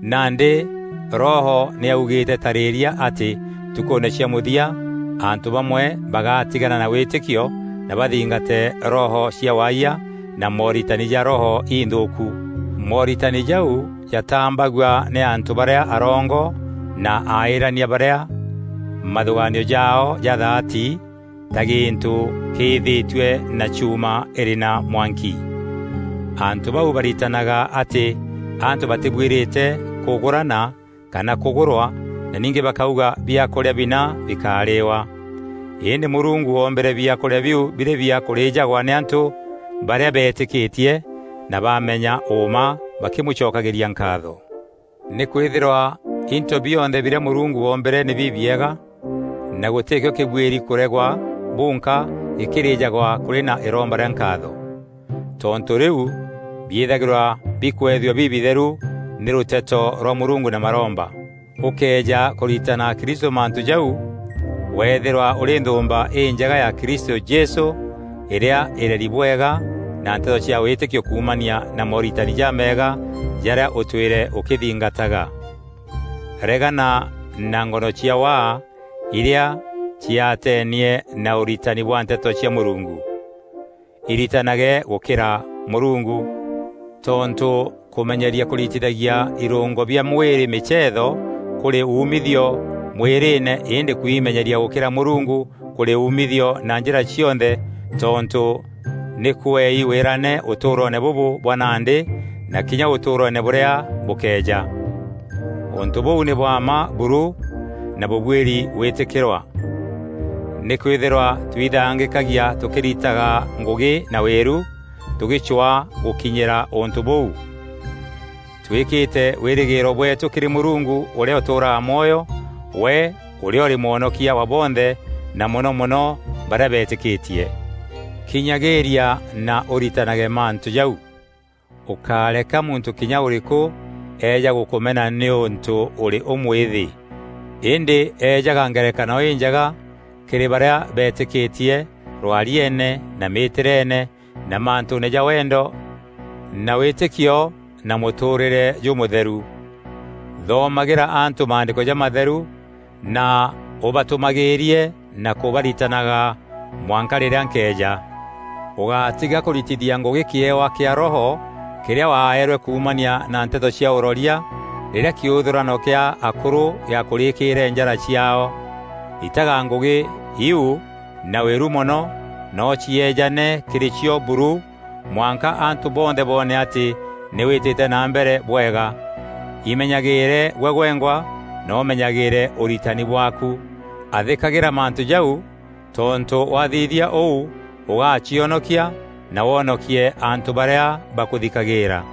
Nandî Roho nî augîîte tarîîria atî ntukûûne cia mûthia, antû bamwe bagatigana na wîtîkio na bathingate roho cia waayia na mooritani ja roho inthûûku. Mooritani jau jatambagua nî antû barîa arongo na aîîrania barîa mathûgaanio jaao jathaati ta gîntû kîîthîtue na chuuma îrî na mwanki. Antû bau baritanaga atî antû batîbuîrîte kûgûrana kana kûgûrwa na ningî bakauga biakûrîa bina bikárîîwa. Îndî Mûrungu oombîre biakûrîa biu birî bia kûrîîjagwa nî antû barîa beetîkîtie na baamenya ûûma bakîmûcokagîria nkaatho. Nîkwîthîrwa into bionthe birîa Mûrungu oombîre nî bibiega, na gûtîkîo kîbuîri kûregwa bunka gîkîrîîjagwa kûrî na îromba rîa nkaatho. Tontû rîu biîthagîrwa bikweethua bibitheru nî rûteto rwa Mûrungu na maromba. Ûkëeja kûritana akristû mantû jau, weethîrwa ûrî nthûûmba înjega ya Kristû Jesû îrîa îreri bwega na nteto cia wîtîkio kuumania na mooritani jameega jarîa ûtwîre ûkîthingataga. Regana na ngono cia waa irîa ciaateenie na ûritani bwa Nteto cia Mûrungu. Iritanage gûkîra Mûrungu, tontû kûmenyeria kûritithagia irûngo bia mwîrî mîceetho kûrî umithio mwîrîîne îndî kwimenyeria gûkîra Mûrungu kûrî umithio na njîra cionthe tontû nî kweei wîrane ûtûûroone bûbû bwa nandî na kinya ûtûûroone bûrîa bûkeeja. Ûntû bûu nî bwa mma buru na bûbuîri gwîtîkîrwa. Nîkwîthîrwa tuithangîkagia tûkîritaga ngûgî na wîru, tûgîcwaa gûkinyîra ûntû bûu, tûîkîte wîrîgîîro bweetû kîrî Mûrungu ûrîa ûtûûraga mwoyo, we ûrîa ûrî Mwonokia wa bonthe na mono mono barîa beetîkîtie. Kinyagîîria na ûritanage mantû jau. Ûkáreka muntû kinya ûrîkû eeja gûkûmena nîûntû ûrî ûmwîthî. Îndî eejaga ngerekano înjega kîrî barîa betîkîtie rwarieene na mîtîreene na mantûûne ja wendo na wîtîkio na mûtûûrîre jûmûtheru. Thoomagîra antû Maandîko jamatheru na ûbatûmagîîrie na kûbaritanaga mwanka rîrîa nkeeja. Ûgátiga kûritithia ngûgî kîewa kîa Roho kîrîa waeerwe kuumania na nteto cia ûroria rîrîa kîûthûrano kîa akûrû gîakûrîîkîrîre njara ciaao. Ritaga ngûgî iu na wîru mono na ûcieejane kîrî cio buru, mwanka antû bonthe boone atî nî wîtîte na mbere bwega. Imenyagîîre gwe gwengwa na ûmenyagîîre ûritani bwaaku. Athîkagîra mantû jau, tontû wathithia ûu, ûgacionokia na wonokie antû barîa bakûthikagîîra.